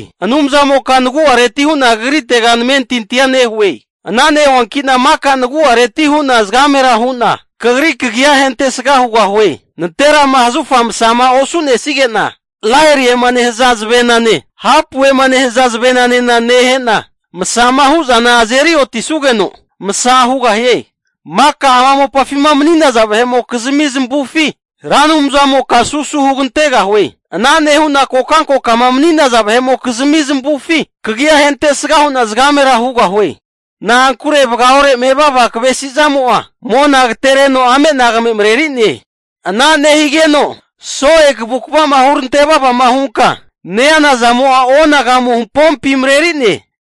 Anumzamoka nagu'areti hu'na kagritera namentintia nehue. Ana nehuanki'na maka nagu'areti hu'na zagamera nehu'na, kagri kagia ahentesga hugahue. Nanterama zahufa masama osu'nesige'na oti'na laeliema nehaza zavenane, hapu'ema nehaza zavenanena nehe'na masama hu'zana azeri otisugeno masa hugahie. Maka ama mopafima mani'naza vahe'mokizmi zamavufi, Ra Anumzamoka susu hugantegahue. Ana nehu'na kokankokama nemaniza vahe'mokizmi zamavufi kagi'a ahentesga hu'na zagamera hugahue. Na'ankure vagaore mevava kavesi zamo'a mona agatereno ame'nagame mareri'ne. Ana nehigeno so'e kavukva'ma hurante vavama hunka neana zamo'a onagamu hampompi mareri'ne.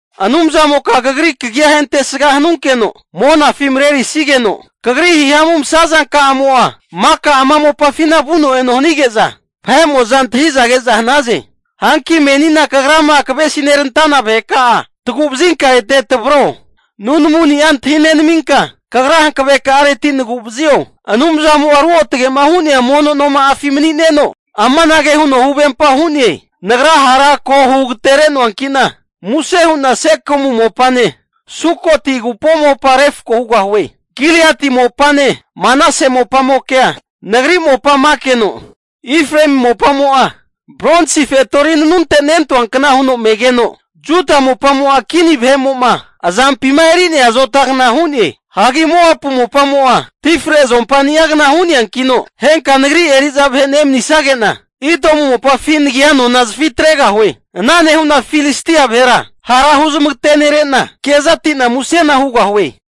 Anumzamoka kagri kagia ahentesga hanunkeno monafi marenerisigeno, kagri hihamu masazankamo'a maka ama mopafina vuno eno hanige'za vahe'mo'za antahiza ke'za hanaze. Hanki menina kagrama kavesinerantana vaheka'a tagu'vazinka ete tavaro. Nunamuni'a antahi nenaminka kagra hankave ka'areti nagu'vazio. Anumzamo'a ruotage'ma hu'nea mono noma'afi mani'neno amanage huno huvempa hu'ne. Nagra hara ko hugatere'noanki'na, muse hu'na Sekemu mopane Sukoti agupo mopa refko hugahue. Giliati mopane Manase mopamokea nagri mopa menakeno, Efraemi mopamo'a bronsi fetori nanunte nentanuankna huno megeno, Juda mopamo'a kini vahe'mo'ma azampima e'neria azotani'agna hu'ne. Hagi Moapu mopamo'a tifre zuompa ni'agna hu'neankino, henka nagri eri'za vahe nemanisige'na, Idomu mopafi nagia nona zafi atregahue. Ana nehu'na Filistia vahera hara huzmagatenere'na, kezati'na musena hugahue.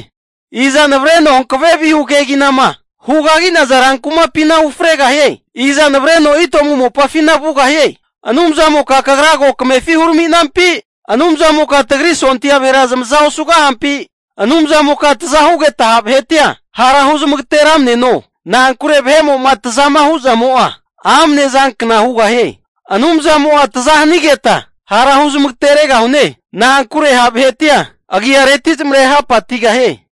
Iza navareno hankave vihu keginama hugagi'naza rankumapina ufregahie? Iza navareno Idomu mopafina vugahie? Anumzamoka kagra ko kamefi hurami'nampi? Anumzamoka tagri sondia vahera zamaza osugahampi? Anumzamoka taza hugeta ha' vahetia hara huzmagateramneno. Na'ankure vahe'mo'ma tazama hu'zamo'a, amne zankna hugahie. Anumzamo'a taza hanigeta hara huzmageteregahune. Na'ankure ha' vahetia agiareti zamare hapatigahie.